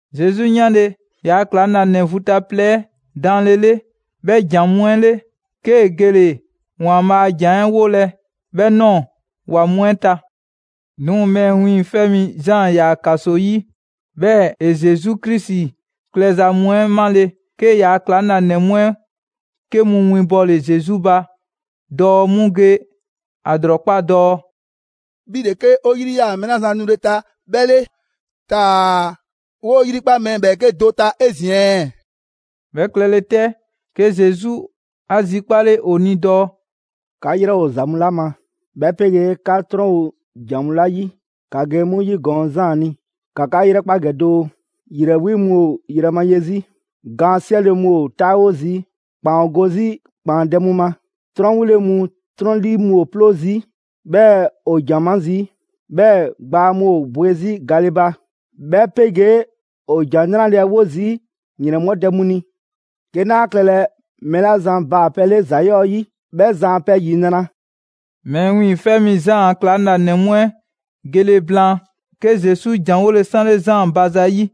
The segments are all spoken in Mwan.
Zesu 'yanle‑ ‑yaa' ‑klaŋlanɛ vu ta plɛ 'ɛ daanlele 'bhɛ ‑jan mu 'ɛ 'le, 'kee‑ gele‑ ‑Waanbhaa' a ‑jan 'ɛ 'wolɛ‑ 'bhɛ ꞊nɔɔ ‑wa mu 'ɛ ta. 'Duŋ‑ Mɛɛ Wiiŋfɛ' Mi Zaan ‑yaa ‑kaso 'yi, 'bhɛɛ‑ ‑e Zesu Krisi klɛza mu 'ɛ 'male‑; 'kee‑ ‑yaa' ‑klaŋlanɛ mu 'ɛ 'ke mu 'winbɔle Zesu ba dɔɔ 'mu ge ‑a ‑lrɔkpa' dɔɔ: «'Bhi ‑le 'ke 'o 'yri 'yaa‑ mɛɛ 'la zan nule ta 'bhɛ 'le, taa‑ 'woo‑ 'yrikpa mɛɛ ‑bhɛɛke' do ta 'ezin‑ ɛɛ?» 'Bhɛ klɛle 'tɛ, 'ke Zesu 'a 'zikpale ‑o ni dɔɔ: «'Ka ‑yrɛ ‑o ‑za mu 'la ma, 'bhɛ 'pegee 'ka 'trɔn ‑o ‑jan mu 'la 'yi, ‑ka ge 'mu 'yigɔɔn‑ Zaan ni, ‑ka 'ka 'yrɛkpa ‑gɛ doo: ‑Yrɛ 'wi mu ‑o yrɛ ma ye 'zi, gaan 'siɛle‑ mu ‑o 'taawo zii', ‑kpaan ‑o go 'zi ‑kpaandɛ' mu ma, 'trɔn 'wile‑ mu 'trɔn 'lii mu ‑o 'ploo zii', 'bhɛɛ‑ ‑o ‑jan ma zii'. 'Bhɛɛ‑ gbaa mu ‑o bwe 'zi gale ba, 'bhɛ 'pegee ‑o ‑Jan 'Nrale‑ 'ɛ 'wo zii' ‑yrɛnbhɔdɛ mu ni. 'Ke 'naa klɛlɛ mɛɛ 'la zan baa‑ pɛ 'le ‑za 'yɔɔ‑ 'yi, 'bhɛ zan a pɛ ‑yinra'.» Mɛɛ Wiiŋfɛ' Mi Zaan a ‑klaŋlanɛ mu 'ɛ gele blaan, 'ke Zesu ‑janwole 'sanle Zaan ba zayi'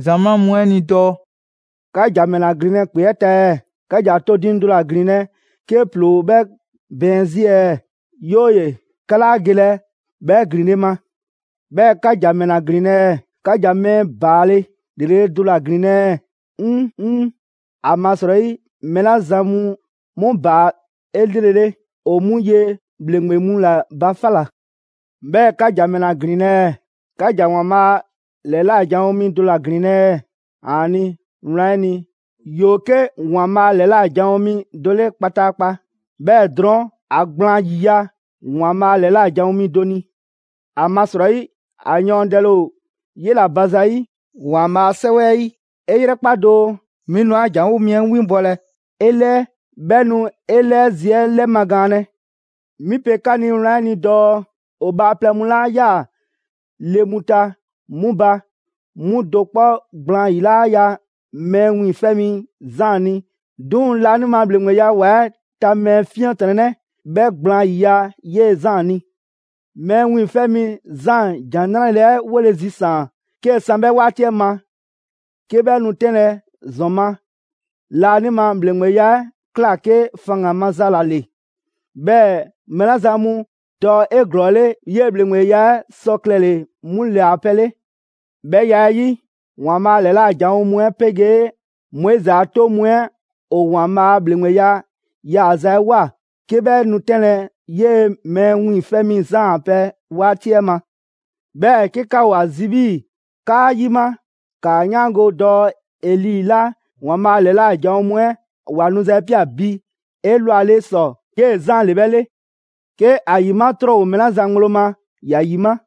‑zamaa' mu 'ɛ ni dɔɔ: «'Ka ‑ja ‑mɛla ‑glinlɛ' ‑kpe 'ɛ ta ɛɛ? 'Ka ‑ja to diiŋ do ‑la ‑glinlɛ' 'ke ‑ploo ‑o 'bhɛ bɛɛn 'zi ɛɛ? 'Yooye‑, 'ka 'laa gelɛ 'bhɛ ‑glinle' ma. 'Bhɛɛ‑ 'ka ‑ja ‑mɛla ‑glinlɛ' ɛɛ? 'Ka ‑ja mɛɛ ‑baale' ‑lrele' do ‑la ‑glinlɛ' ɛɛ? 'ŊŊ‑! ‑Amasrɔyi mɛɛ 'la zan mu 'mu baa 'elrele ‑o 'mu ye ‑bhleŋgbe mu ‑la ba 'fa ꞊la. 'Bhɛɛ‑ ka ‑ja ‑mɛla ‑glinlɛ' ɛɛ? 'Ka ‑ja ‑Waanbhaa' a ‑lɛla' janwo mi do ‑la ‑glinlɛ' ɛɛ? ‑Aani', wlan 'ɛ ni, ‑yoo 'ke ‑Waanbhaa' ‑lɛla' janwo mi do 'le kpataakpa. 'Bhɛɛ‑ drɔɔn' ‑a gblaan ‑yiya' ‑Waanbhaa' ‑lɛla' janwo mi do ni. ‑Amasrɔyi ‑a yɔɔndɛle ‑o 'yela‑ ba zayi' ‑Waanbhaa' a 'Sɛwɛ 'ɛ 'yi dɔɔ: ‹'E 'yrɛkpa doo! 'Mi nu 'an ‑janwo' mi 'ɛ 'winbɔlɛ 'e 'lɛɛ, 'bhɛ nu 'e 'lɛɛ zi 'ɛ 'lɛmagaanlɛ.›» «'Mi pe 'ka ni wlan 'ɛ ni dɔɔ: ‑O bhaaplɛŋ mu 'la ꞊yaa ‑le mu ta 'mu ba, 'mu do 'kpɔ gblaan 'yi 'laa ya Mɛɛ Wiiŋfɛ' Mi Zaan ni 'Duŋ‑ laanima ‑bhleŋgbeya ‑wa 'ɛ ta mɛɛ 'fiɛntrɔnnɛ 'ɛ 'bhɛ gblaan 'yiya‑ 'yee‑ Zaan ni. Mɛɛ Wiiŋfɛ' Mi Zaan ‑Jan 'Nrale‑ 'ɛ 'wole‑ zisaan‑ 'kee‑ san 'bhɛ 'waati 'ɛ ma, 'ke 'bhɛ nu 'tɛnlɛ‑ ‑zɔn ma, laanima ‑bhleŋgbeya 'ɛ ꞊kla 'ke faŋgan‑ maza ‑la ‑le. 'Bhɛɛ‑ mɛɛ 'la zan mu dɔ 'eglɔɔle 'yee‑ ‑bhleŋgbeya 'ɛ sɔ klɛle‑ 'mu ‑le a pɛ 'le. 'Bhɛ ya 'ɛ 'yi, ‑Waanbhaa' ‑lɛla' janwo mu 'ɛ 'pegee Moizi a 'toŋ mu 'ɛ ‑o ‑Waanbhaa' a ‑bhleŋgbeya yaaza 'ɛ ꞊woa, 'ke 'bhɛ nu 'tɛnlɛ‑ 'yee‑ Mɛɛ Wiiŋfɛ' Mi Zaan a pɛ 'waati 'ɛ ma. 'Bhɛɛ‑ 'ke 'ka ‑o ‑a zi 'bhii‑ 'kaa 'yima, ‑kaa 'yaango‑ dɔɔ Eli 'la ‑Waanbhaa' ‑lɛla' janwo mu 'ɛ ‑wa nuza 'ɛ ꞊pia bi 'elwale ‑sɔ 'yee‑ Zaan ‑le 'bhɛ 'le. 'Ke ‑a ‑yima' 'trɔn ‑o mɛɛ 'la zan ŋgblo ma, ‑ya 'yima!»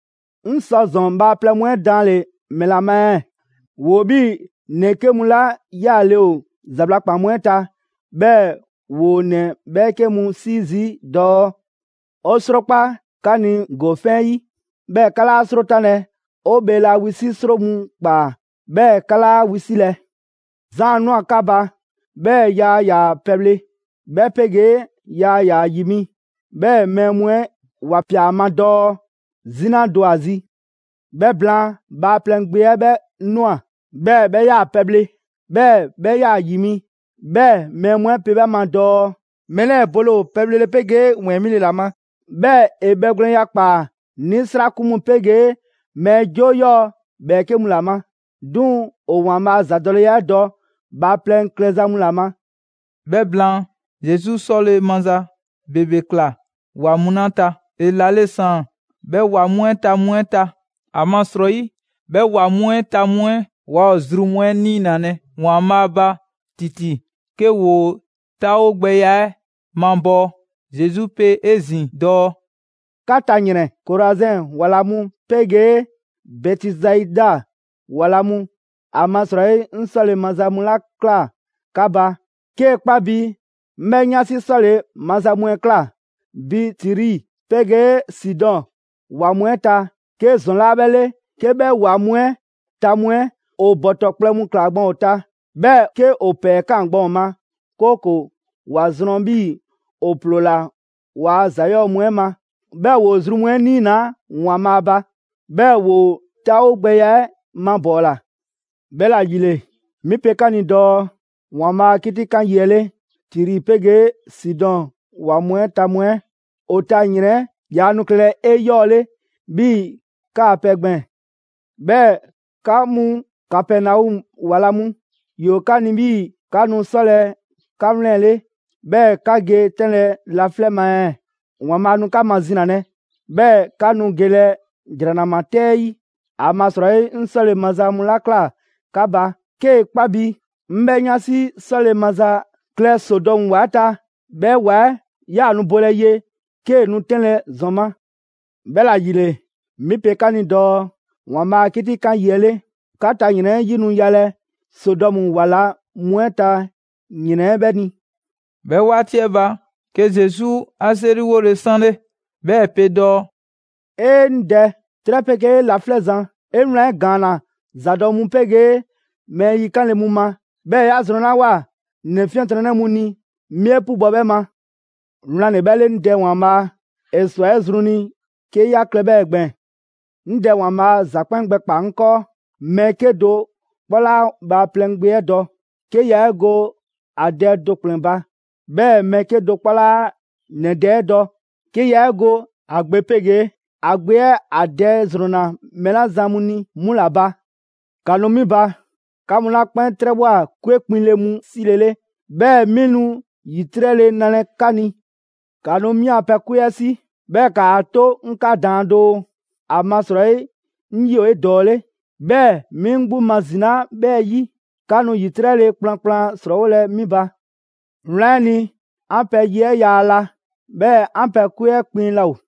«'Ŋ sɔ ‑zɔn bhaaplɛŋ mu 'ɛ danle‑ ‑mɛla ma ɛɛ? ‑Woo 'bhii‑ ‑nɛ 'ke mu 'la 'yaale‑ ‑o ‑zabla' ‑kpan mu 'ɛ ta; 'bhɛɛ‑ ‑woo ‑nɛ 'bhɛɛke mu 'sii zii' dɔɔ: ‹'O 'srokpaa‑ 'ka ni ‑gofɛn' 'yi, 'bhɛɛ‑ 'ka 'laa 'srotanlɛ! 'O bheela wisi' 'sro mu ꞊kpaa, 'bhɛɛ‑ 'ka 'laa wisilɛ!›» «Zaan ꞊nwa 'ka ba, 'bhɛɛ‑ yaa ‑yaa pɛbhle, 'bhɛ 'pegee yaa ‑yaa ‑yi mi. 'Bhɛɛ‑ mɛɛ mu 'ɛ ‑wa ꞊pia a ma dɔɔ: ‹'Zina do ‑o ‑a zi.› 'Bhɛ blaan, Bhaaplɛŋ Gbe 'ɛ 'bhɛ ꞊nwa, 'bhɛɛ‑ 'bhɛ 'yaa‑ pɛbhle, 'bhɛɛ‑ 'bhɛ 'yaa‑ ‑yi mi. 'Bhɛɛ‑ mɛɛ mu 'ɛ pe 'bhɛ ma dɔɔ: ‹Mɛɛ 'lɛɛ‑ bole ‑o pɛbhlele 'pegee ‑wɛɛn 'mile‑ ‑la ma; 'bhɛɛ‑ ‑e bhɛgwlɛnya ‑kpaa 'nisrakun mu 'pegee mɛɛ 'joo 'yɔɔ‑ ‑bhɛɛke' mu ‑la ma!› 'Duŋ‑ ‑o ‑Waanbhaa' a ‑zadɔleya 'ɛ dɔ bhaaplɛŋ klɛza mu ‑la ma.» 'Bhɛ blaan, Zesu 'sɔle‑ maza ‑bebe ꞊kla ‑wa mu 'la ta, ‑e ‑lale' ‑saan 'bhɛ ‑wa mu 'ɛ ta mu 'ɛ ta. ‑Amasrɔyi 'bhɛ ‑wa mu 'ɛ ta mu 'ɛ waa ‑o zru mu 'ɛ 'niinalɛ ‑Waanbhaa' ba ‑titi 'ke ‑woo 'taawogbɛya 'ɛ mabɔɔ. Zesu pe 'ezin‑ dɔɔ: «'Ka ta ‑yrɛn! Korazɛn ‑wa ‑la mu 'pegee Bɛtisaida ‑wa ‑la mu! ‑Amasrɔyi 'ŋ 'sɔle‑ maza mu 'la ꞊kla 'ka ba, 'kee‑ 'kpa bi 'ŋ 'bhɛ 'yansi 'sɔle‑ maza mu 'ɛ ꞊kla bi Tiri 'pegee Sidɔn ‑wa mu 'ɛ ta, 'ke ‑zɔn 'laa 'bhɛ 'le 'ke 'bhɛ ‑wa mu 'ɛ ta mu 'ɛ ‑o ‑bɔtɔ kplɛ mu ꞊klaa gban ‑o ta, 'bhɛɛ‑ 'ke ‑o ‑pɛɛ ‑kaan gban ‑o ma, 'kooko‑ ‑wa zrɔn 'bhii‑ ‑o ‑ploola waa ‑za 'yɔɔ‑ mu 'ɛ ma, 'bhɛɛ‑ ‑woo zru mu 'ɛ 'niinaa‑ ‑Waanbhaa' ba, 'bhɛɛ‑ ‑woo 'taawogbɛya 'ɛ mabɔɔla. 'Bhɛla‑ ‑yile, 'mi pe 'ka ni dɔɔ: ‑Waanbhaa' a 'kitikan yi 'ɛ 'le, Tiri 'pegee Sidɔn ‑wa mu 'ɛ ta mu 'ɛ ‑o ta ‑yrɛn 'ɛ yaa nu klɛlɛ 'eyɔɔle 'bhii‑ 'kaa‑ pɛ 'ɛ gbɛɛn‑. 'Bhɛɛ‑ 'ka mu Kapɛnɔmu ‑wa la mu, ‑yoo 'ka ni 'bhii‑ 'ka nu 'sɔlɛ‑ 'ka ‑wlɛnle', 'bhɛɛ‑ 'ka ge 'tɛnlɛ‑ laflɛ' ma ɛɛ? ‑Waanbhaa' nu 'ka mazinalɛ, 'bhɛɛ‑ 'ka nu gelɛ ‑jranama 'tɛ 'ɛ 'yi. ‑Amasrɔyi 'ŋ 'sɔle‑ maza mu 'la ꞊kla 'ka ba, 'kee‑ 'kpa bi 'ŋ 'bhɛ 'yansi 'sɔle‑ maza klɛ Sodɔmu ‑wa 'ɛ ta, 'bhɛ ‑wa 'ɛ 'yaa‑ nu bolɛ ye 'kee‑ nu 'tɛnlɛ‑ ‑zɔn ma. 'Bhɛla‑ ‑yile, 'mi pe 'ka ni dɔɔ: ‑Waanbhaa' a 'kitikan yi 'ɛ 'le, 'ka ta ‑yrɛn 'ɛ 'yi nu yalɛ Sodɔmu ‑wa ‑la mu 'ɛ ta ‑yrɛn 'ɛ 'bhɛ ni.» 'Bhɛ 'waati 'ɛ ba, 'ke Zesu 'a 'seriwole 'sanle, 'bhɛɛ‑ ‑e pe dɔɔ: «'E! 'Ŋ Dɛ, 'trɛ 'pegee laflɛ' Zan, 'e wlan 'ɛ ‑gaanna ‑zadɔ' mu 'pegee mɛɛ yikanle mu ma, 'bhɛɛ‑ 'ya zrɔnlawoa ‑nɛ 'fiɛntrɔnnɛ mu ni, 'mi 'e 'pubɔ‑ 'bhɛ ma. Wlan ‑le 'bhɛ 'le, 'Ŋ Dɛ ‑Waanbhaa', ‑e ‑swa 'e zru ni 'ke 'ya klɛ 'bhɛɛ‑ gbɛɛn‑.» «'Ŋ Dɛ ‑Waanbhaa ‑za 'kpɛn gbɛkpaa‑ 'ŋ 'kɔɔ. Mɛɛ 'kedo‑ 'kpɔ 'laa Bhaaplɛŋ Gbe 'ɛ dɔ, 'ke yaa 'e go ‑a Dɛ do ‑kplɛn ba. 'Bhɛɛ‑ mɛɛ 'kedo‑ 'kpɔ 'laa ‑nɛ Dɛ 'ɛ dɔ, 'ke yaa 'e go ‑a Gbe 'pegee ‑a Gbe 'ɛ ‑a Dɛ ‑zrɔnna mɛɛ 'la zan mu ni 'mu ‑la ba.» «‑Ka nu 'mi ba, 'ka mu 'la 'kpɛn 'trɛbhwa꞊ 'kwe kpiŋle mu 'silele, 'bhɛɛ‑ 'mi nu ‑yitrɛle nalɛ 'ka ni. ‑Ka nu 'mi a pɛ 'kwe 'ɛ 'si, 'bhɛɛ‑ ‑kaa 'to 'ŋ 'ka daan doo, ‑amasrɔyi 'ŋ 'yi ‑o 'edɔɔle, 'bhɛɛ‑ 'mi 'ŋ 'gbu mazinaa, 'bhɛ 'yi, 'ka nu ‑yitrɛle kplankplan ‑srɔɔwolɛ 'mi ba. 'Wlan 'ɛ ni, 'an pɛ ye 'ɛ yaa la, 'bhɛɛ‑ 'an pɛ 'kwe 'ɛ kpiŋ laa ‑o.»